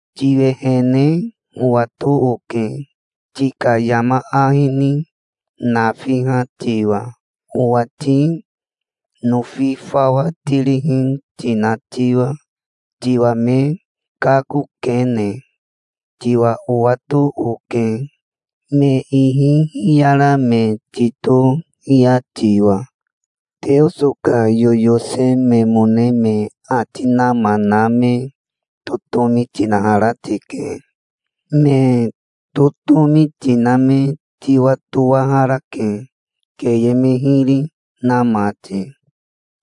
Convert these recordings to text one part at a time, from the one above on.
'Tiwehene owato oke, tika yama ahi ni nafiha tiwa, owati nofi fawa tirihi tina tiwa, tiwa me kakokene. Tiwa owato oke, me ihi hiyara me titohia tiwa. Teoso ka yoyose memone me ati nama na me totomi tinahara tike. Me totomi tina me tiwatowaharake, keye me hiri na mati.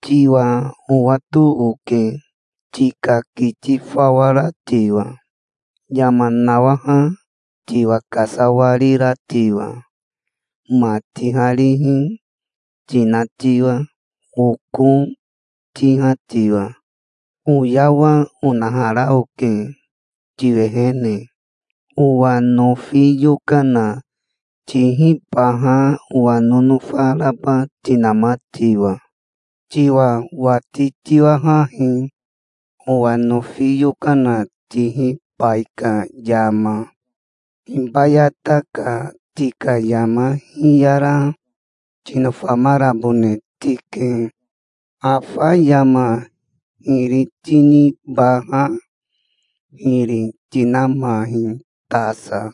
Tiwa owato oke, tika kiti fawa ra tiwa, yama nawaha tiwa kasawarira tiwa, ma tiharihi tina tiwa, oko tiha tiwa'". "'Oyawa onahara oke tiwehene, owa nofi yokana tihibaha owa nonofa raba tinama tiwa. Tiwa wati tiwahahi, owa nofi yokana tihibai ka yama. Hibayata ka tika yama hiyara tinofamarabone tike. Afa yama hiri tinibaha hiri tinamahi tasa.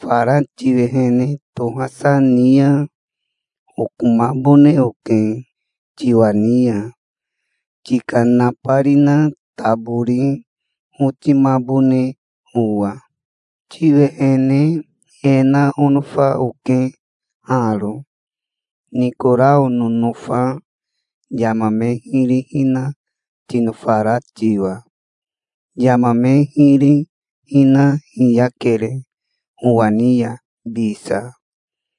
Fara tiwehene tohasa ni ya okomabone oke tiwa ni ya, tika nabarina tabori otimabone owa. Tiwehene e na onofa oke haro, Nikorao nonofa yama me hiri hina tinofara tiwa. Yama me hiri hina hiyakere owa ni ya bisa.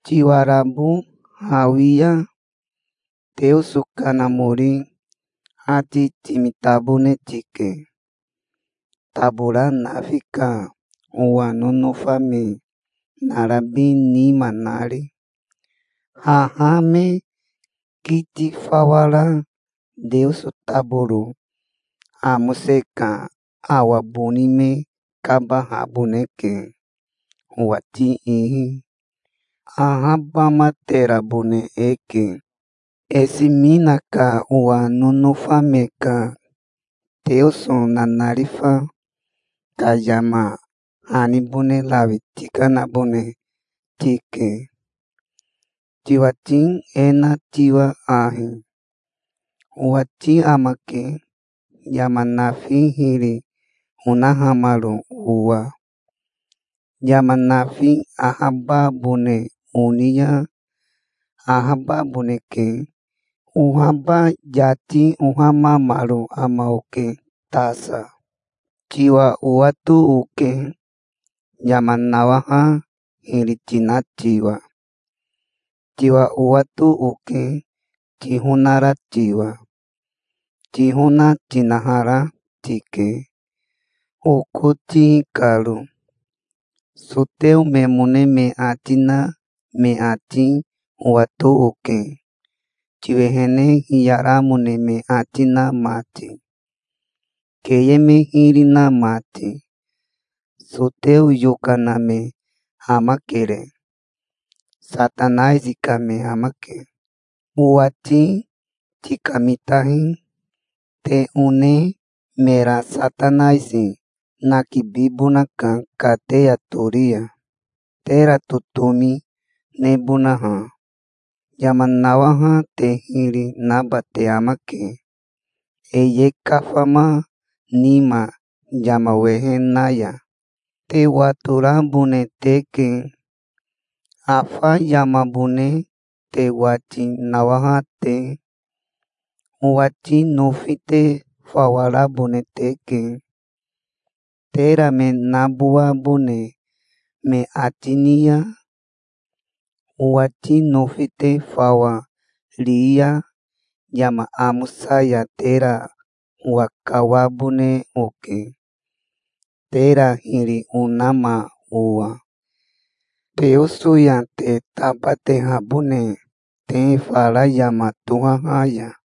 Tiwarabo hawi ya Teoso Kanamori ati timitabone tike, tabora nafi ka owa nonofa me narabi nima nari. Haha me kiti fawa ra Teoso taboro amose ka awa boni me kabahaboneke owati ihi. Haha awa boni e kabi ya e ahabamaterabone eke'". "Esimina ka owa nonofa me ka Teoso nanarifa ka yama hanibone rawi tikanabone tike, tiwati e na tiwa ahi:" "'Owati amake, yama nafi hiri onahamaro owa. Yama nafi ahababone oni ya ahababoneke. Ohaba yati ohamamaro ama oke tasa. Tiwa owato oke, yama nawaha hiri tina tiwa. Tiwa owato oke, tihonara tiwa. Tihona tinahara tike, oko tihi karo. Soteo memone me ati na me ati owato oke, tiwehene hiyaramone me ati na mati, keye me hiri na mati. Soteo yokana me amakere. Satanaisi ka me amake. Owati tikamitahi. Te one mera Satanaisi nakibibonaka kateya tori ya, tera totomi nebonaha. Yama nawaha te hiri naba te amake, e ye kafama nima yama wehe na ya. Te watorabone teke, afa yamabone te wati nawaha te. Owati nofi te fawa rabone teke, tera me nabowabone me ati, ni ya. Owati nofi te fawa ri ya yama amosa ya tera owakawabone oke, tera hiri onama owa, Teoso ya te tabatehabone te fara yama tohaha ya.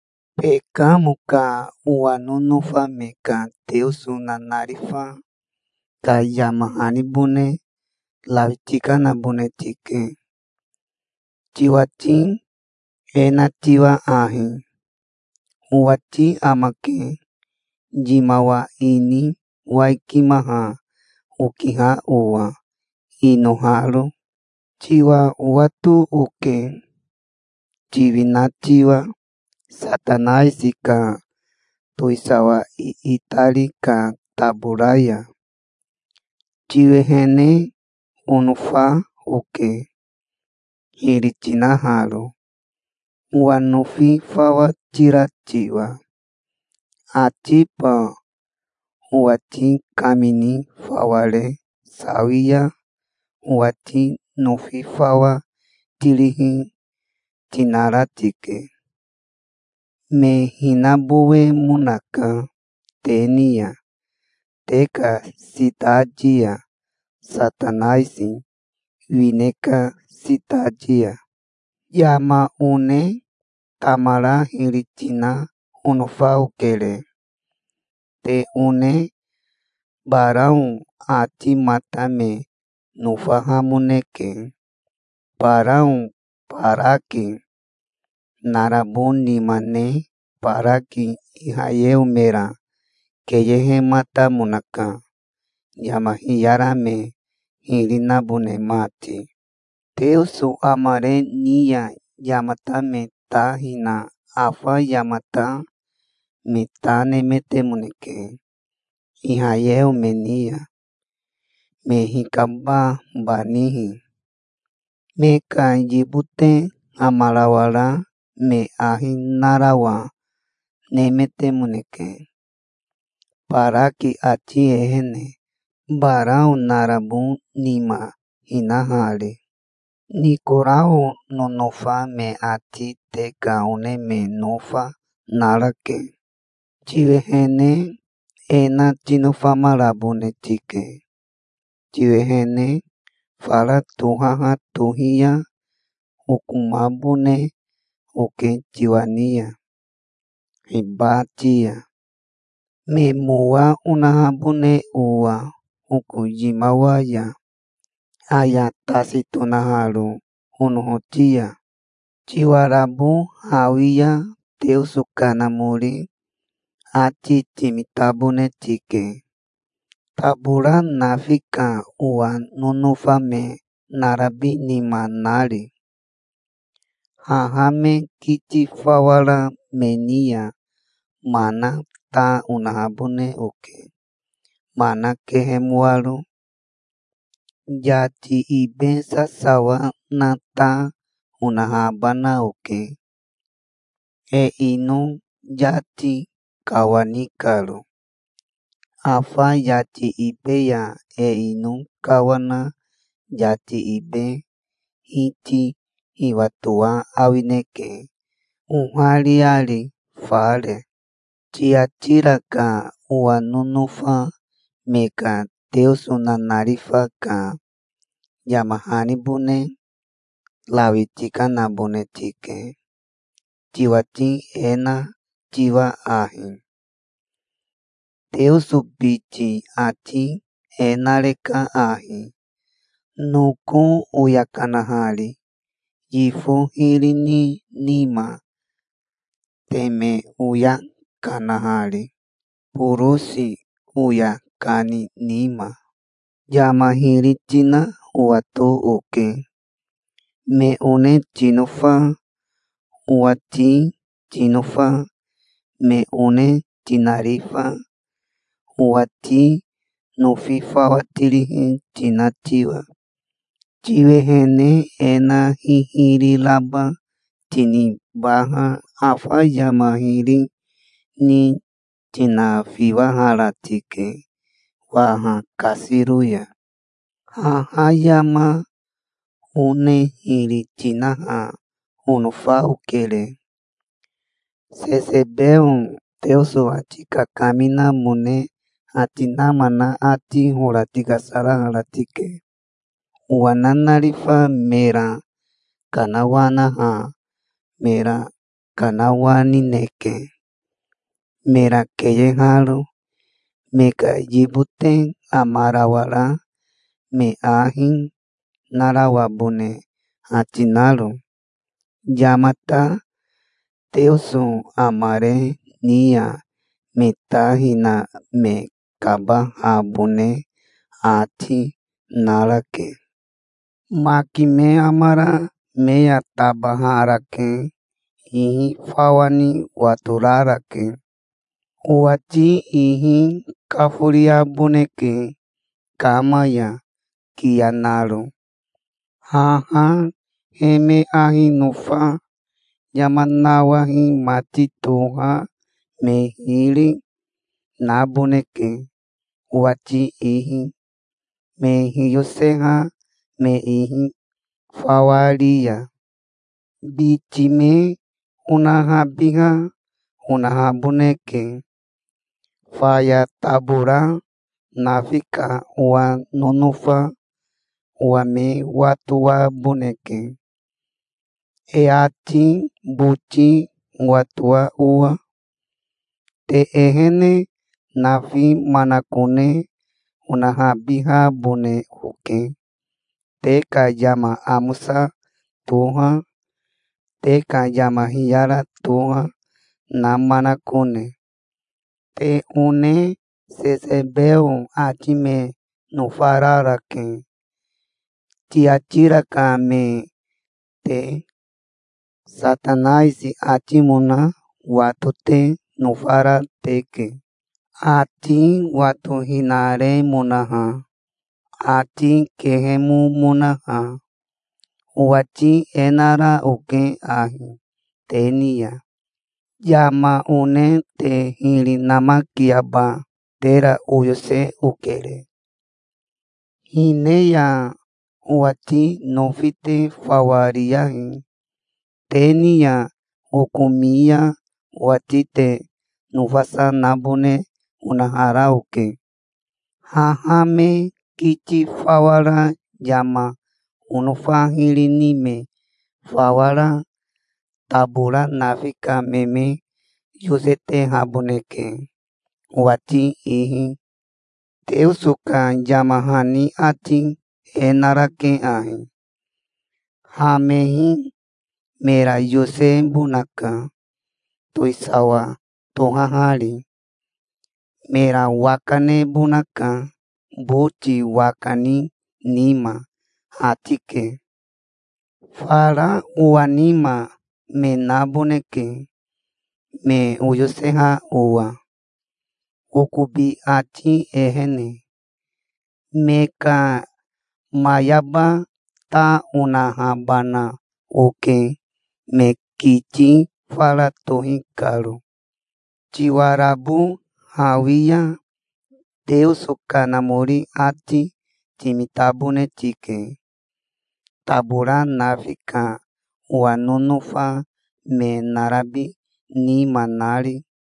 "Bekamo ka owa nonofa me ka Teoso nanarifa ka yama hanibone rawi tikanabone tike, tiwati e na tiwa ahi:" "'Owati amake, yimawa ini waikimaha okiha owa, inoharo. Tiwa owato oke, tiwina tiwa Satanaisi ka towisawa iitari ka tabora ya. Tiwehene onofa oke, hiri tinaharo, owa nofi fawa tira tiwa. Atiba owati kamini fawa re sawi ya owati nofi fawa tirihi, tinara tike. Me hinabowemonaka te ni ya, te ka sitati ya, Satanaisi wine ka sitati ya'". "'Yama one tamara hiri tina onofa okere. Te one Barao atimata me nofahamoneke. Barao Baraki narabo nima ne Baraki Ihayeo mera keyehematamonaka, yama hiyara me hiri nabone mati. Teoso amare ni ya yamata me ta hina afa yamata me ta nemetemoneke, Ihayeo me ni ya, me hikababanihi. Me ka yibote amarawara me ahi narawa nemetemoneke, Baraki ati ehene, Barao narabo nima hinahari. Nikorao nonofa me ati te ka one me nofa narake. Tiwehene e na tinofamarabone tike. Tiwehene fara tohaha tohi ya okomabone oke tiwa ni ya hibati ya, me mowa onahabone owa oko yimawa ya, aya tasi tonaharo onohoti ya. Tiwarabo hawi ya Teoso Kanamori ati timitabone tike, tabora nafi ka owa nonofa me narabi nima nari. Haha me kiti fawa ra me ni ya mana ta onahabone oke, mana kehemoaro. Yati ibe sasawa na ta, onahabana oke, e ino yati kawani karo. Afa yati ibe ya e ino kawana yati ibe hiti hiwatoa awineke, ohariari, fare'". "Tiatira ka owa nonofa me ka Teoso nanarifa ka yama hanibone rawi tikanabone tike, tiwati e na tiwa ahi:" "'Teoso biti ati e nareka ahi, noko oya kanahari yifo hiri ni nima, teme oya kana nari borosi oya kani nima. Yama hiri tina owato oke, me one tinofa, owati tinofa, me one tinarifa, owati nofi fawa tirihi tina tiwa. Tiwehene e na hihiri raba tinibaha afa yama hiri ni tinafiwahara tike waha kasiro ya'". "'Haha yama one hiri tinaha onofa okere. Sesebeo Teoso ati kakaminamone ati nama na ati hora tikasarahara tike. Owa nanarifa mera kanawanaha mera kanawanineke, mera keyeharo, me ka yibote amarawara me ahi narawabone ati naro. Yamata Teoso amare ni ya me ta hina me kabahabone ati, narake. Maki me amara me ya tabaharake. Ihi fawa ni watorarake. Owati ihi kaforiaboneke kama ya kiya naro. Haha he me ahi nofa yama nawahi mati toha me hiri, naboneke, owati ihi, me hiyoseha me ihi fawa ri ya. Biti me onahabiha onahaboneke. Faya tabora nafi ka owa nonofa owa me watowaboneke, e ati boti owatoa owa. Te ehene nafi manakone onahabihabone oke, te ka yama amosa toha, te ka yama hiyara toha, na manakone. Te one Sesebeo ati me nofararake, Tiatira ka me te. Satanaisi atimona wato te nofara teke, ati watohinaremonaha, ati kehemomonaha. Owati e nara oke ahi te ni ya: yama one te hiri namakiaba tera oyose okere. Hine ya owati nofi te fawa riyahi. Te ni ya okomi ya owati te nofasa nabone onahara oke. Haha me kiti fawa ra yama onofa hiri ni me fawa ra, tabora nafi ka me me yosetehaboneke owati ihi. Teoso ka yama hani ati e narake ahi: "Hamehi mera yosebonaka, towisawa tohahari. Mera waka nebonaka boti waka ni nima", ati ke. Fara owa nima me naboneke, me oyoseha owa okobi ati ehene. Me ka mayaba ta onahabana oke, me kiti fara tohi karo. Tiwarabo hawi ya Teoso Kanamori ati timitabone tike, tabora nafi ka owa nonofa me narabi nima nari.'"